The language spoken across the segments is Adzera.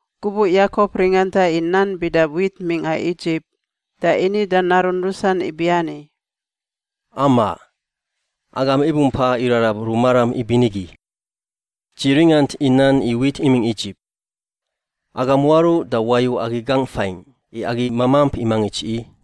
Gubuꞌ Yakop ringanta i nan bida wit mingꞌa Idzip, da ini da narun rusan ibiani, “Amaꞌ! Agam ibumpa irarab rumaram ibinigi? Dzi ringant i nan i wit imingꞌ Idzip. Agam waruꞌ da wayu agi gangꞌ fain, i agi mamamp i mangits i.”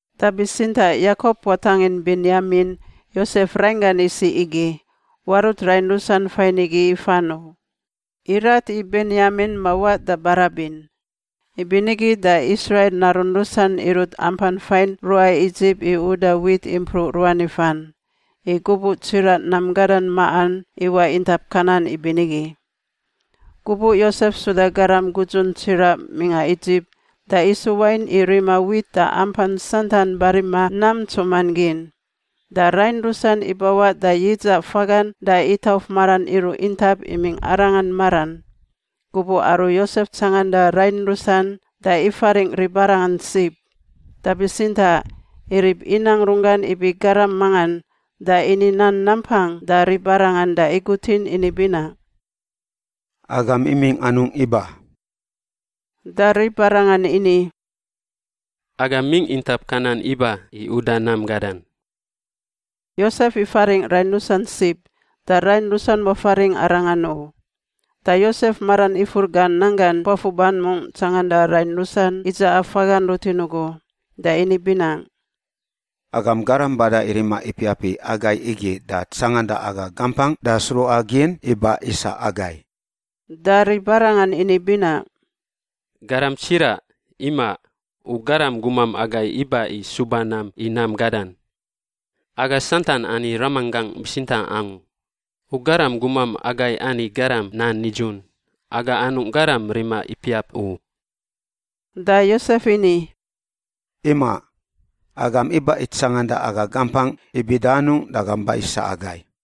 Da bitsintaꞌ Yakop watangin Benyamin, Yosef rainggan isiꞌ igi, warut rain ruas fain igi ifan u. Irat i Benyamin mawaꞌ da barabin. Ibinigi da Israil narun rusan irut ampan fain ruꞌa Idzip i uda wit impruꞌ ruan ifan, i gubuꞌ tsiraꞌ nam gadan maꞌan iwaꞌ intap Kanan ibinigi. Gubuꞌ Yosef suda garam gudzun tsiraꞌ mingꞌa Idzip da isu wain i rima wit da ampan santan barima nam ntsuman gin. Da rain rusan ibawaꞌ da yidzaꞌ fagan da itauf maran iruꞌ intap imingꞌ arangan maran. Gubuꞌ aru Yosef tsanganda rain rusan da ifaringꞌ ribarangan sib, da bitsintaꞌ irib inang runggan ibi garam mangan da ini nan nampang da ribarangan da igutin ini binaꞌ, “Agam imingꞌ anungꞌ iba?” Da ribarangan ini, “Aga mingꞌ intap Kanan iba i uda nam gadan.” Yosef ifaringꞌ rain rusan sib, da rain rusan wafaringꞌ arangan u. Da Yosef maran ifur gan nanggan puafuban mungꞌ tsanganda rain rusan idzaꞌa fagan rutin ugu, da ini binaꞌ, “Agam garam bada i rima ipiap i agai igi da tsanganda aga gampangꞌ da sruꞌagin i ba-isa agai.” Da ribarangan ini binaꞌ, “Garam tsiraꞌ, imaꞌ. U garam gumam agai iba i suba nam i nam gadan. Aga santan ani ramanggangꞌ bitsintaꞌ angu. U garam gumam agai ani garam nan nidzun; aga anungꞌ garam rima ipiap u.” Da Yosef ini, “Imaꞌ. Agam iba i tsanganda aga gampangꞌ i bida anungꞌ da agam ba-isa agai.”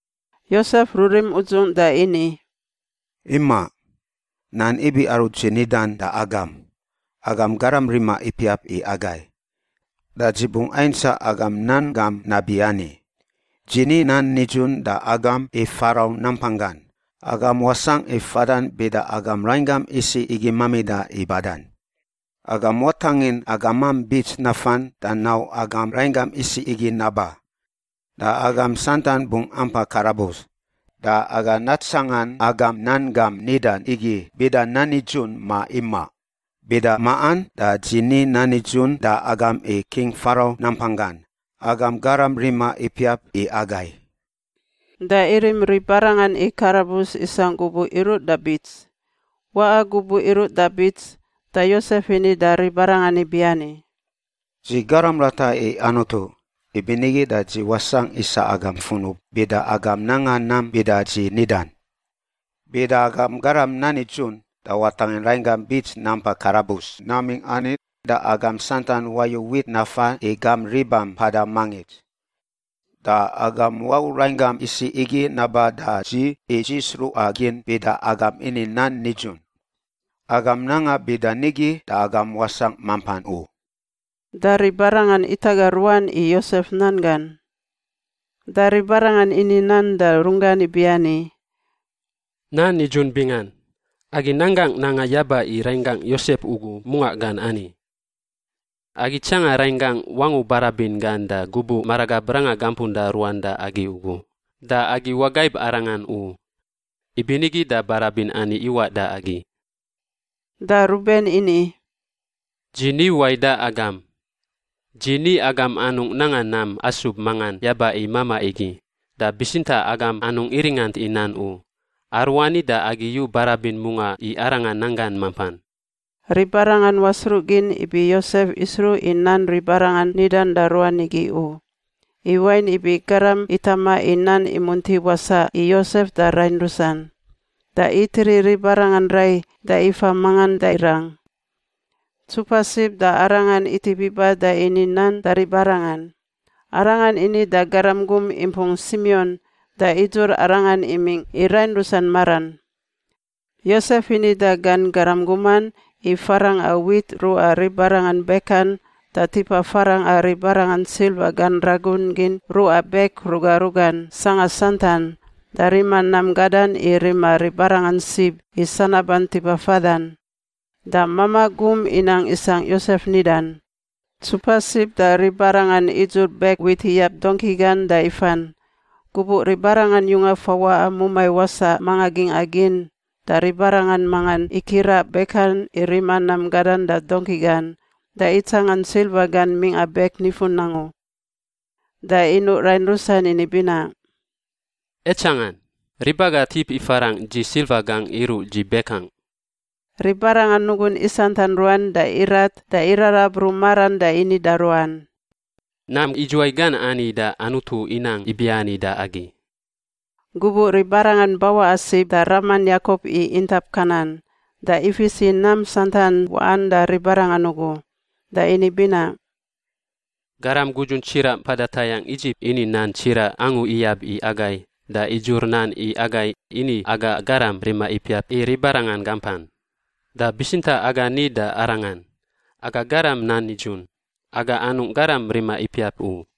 Yosef rurim udzungꞌ da ini, “Imaꞌ. Nan ibi aru dzi nidan da agam. Agam garam rima ipiap i agai. Da dzi bungꞌ aintsaꞌ agam nan gam nabiani: dzi ni nan nidzun da agam i Farau nampanggan, agam wasangꞌ i fadan bida agam rainggam isiꞌ igi mamida i badan. Agam watangin agamam bits nafan da nau agam rainggam isiꞌ igi naba. Da agam santan bungꞌ ampa karabus. Da aga natsangan agam nan gam nidan igi bida nan nidzun ma imaꞌ. Bida maꞌan da dzi ni nan nidzun da agam i King Farau nampanggan, agam garam rima ipiap i agai.” Da irim ribarangan i karabus isangꞌ gubuꞌ iruꞌ da bits. Waꞌa gubuꞌ iruꞌ da bits, da Yosef ini da ribarangan ibiani, “Dzi garam rata i Anutu, ibinigi da dzi wasangꞌ isa agam funub bida agam nanga nam bida dzi nidan. Bida agam garam nan nidzun da watangin rainggam bits nampa karabus namingꞌ ani da agam santan wayu wit nafa i gam ribam mpada mangits. Da agam wau rainggam isiꞌ igi naba da dzi i dzi sruꞌagin bida agam ini nan nidzun. Agam nanga bida nigi da agam wasangꞌ mampan u.” Da ribarangan itaga ruan i Yosef nan gan. Da ribarangan ini nan da runggan ibiani, “Nan nidzun bingan! Agi nanggangꞌ nanga yaba i rainggangꞌ Yosef ugu mungaꞌ gan ani. Agi tsanga rainggangꞌ wangu barabin gan da gubuꞌ maragab ranga gampunda ruan da agi ugu, da agi wagaib arangan u. Ibinigi da barabin ani iwaꞌ da agi.” Da Ruben ini, “Dzi ni wai da agam? Dzi ni agam anungꞌ nanga nam asub mangan yaba i mamaꞌ igi. Da bitsintaꞌ agam anungꞌ iringant i nan u. Aruani da agi yu barabin mungaꞌ i arangan nanggan mampan.” Ribarangan wasruꞌgin ibi Yosef isruꞌ i nan ribarangan nidan da ruan igi u, i wain ibi garam itama i nan imunti wasaꞌ i Yosef da rain rusan. Da itiri ribarangan rai da ifa mangan da irang. Ntsupa sib da arangan itip iba da ini nan da ribarangan. Arangan ini da garam gum impung Simion da idzur arangan imingꞌ i rain rusan maran. Yosef ini da gan garam guman i farangꞌa wit ruꞌa ribarangan bekan da tipa farangꞌa ribarangan silva gan ragun gin ruꞌa bek ruga rugan sangꞌa santan, da rima nam gadan i rima ribarangan sib i sanaban tipa fadan. Da mamaꞌ gum inang isangꞌ Yosef nidan. Ntsupa sib da ribarangan idzur bek wit iyab dongki gan da ifan. Gubuꞌ ribarangan yunga fawaꞌa mumai wasaꞌ manga gingꞌa gin da ribarangan mangan ikiraꞌ bekan i rima nam gadan da dongki gan da itsangan silva gan mingꞌa bek nifun angu. Da inuꞌ rain rusan ini binaꞌ, “Aitsangan! Rib aga tip ifarangꞌ dzi silva gangꞌ iruꞌ dzi bekangꞌ.” Ribarangan nugun isantan ruan da irat da irarab ru maran da ini da ruan, “Nam idzuwai gan ani da Anutu inang ibiani da agi?” Gubuꞌ ribarangan bawaꞌa sib da raman Yakop i intap Kanan, da ifis i nam santan waꞌan da ribarangan ugu. Da ini binaꞌ, “Garam gudzun tsiraꞌ mpada tayangꞌ Idzip ini nan tsiraꞌ angu iyab i agai da idzur nan i agai ini aga garam rima ipiap i ribarangan gampan. Da bitsintaꞌ aga ni da arangan, ‘Aga garam nan nidzun; aga anungꞌ garam rima ipiap u.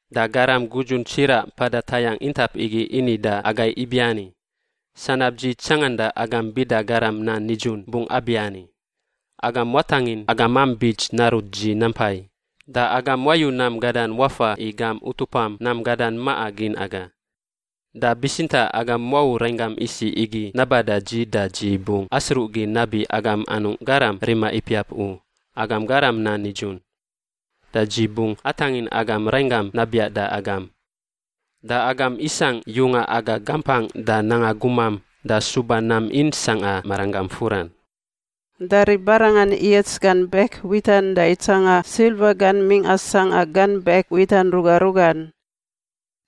Da garam gudzun tsiraꞌ mpada tayangꞌ intap igi ini da agai ibiani, ‘Sanab dzi tsanganda agam bida garam nan nidzun bungꞌ abiani: Agam watangin agamam bits narut dzi nampai. Da agam wayu nam gadan wafa i gam utupam nam gadan maꞌa gin aga. Da bitsintaꞌ agam wau rainggam isiꞌ igi naba da dzi da dzi bungꞌ asruꞌgin nabi agam anungꞌ garam rima ipiap u, agam garam nan nidzun. Da dzi bungꞌ atangin agam rainggam nabiaꞌ da agam. Da agam isangꞌ yunga aga gampangꞌ da nanga gumam da suba nam in sangꞌa maranggam furan.’” Da ribarangan iyats gan bek witan da itsanga silva gan mingꞌa sangꞌa gan bek witan ruga rugan.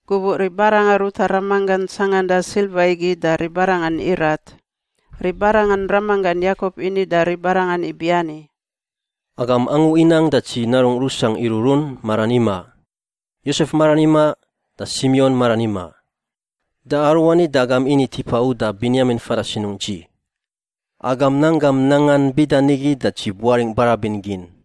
Gubuꞌ ribarangan ruta ramanggan tsanganda silva igi da ribarangan irat. Ribarangan ramanggan Yakop ini da ribarangan ibiani, “Agam angu inang da dzi narungꞌ rusangꞌ iruꞌrun maran imaꞌ. Yosef maran imaꞌ, da Simion maran imaꞌ. Da aruani da agam ini tipa uda Benyamin fada sinungꞌ dzi. Agam nanggam nangan bida nigi da dzi buaringꞌ barabin gin!”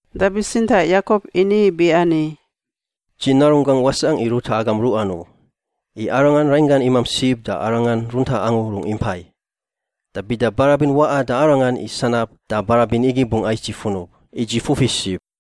Da bitsintaꞌ Yakop ini ibiani, “Dzi narunggangꞌ wasangꞌ i ruta agam ruꞌan u, i arangan rainggan imamp sib da arangan runtaꞌ angu rungꞌ impai. Da bida barabin waꞌa da arangan i sanab da barabin igi bungꞌ ais dzi funub, i dzi fufi sib.”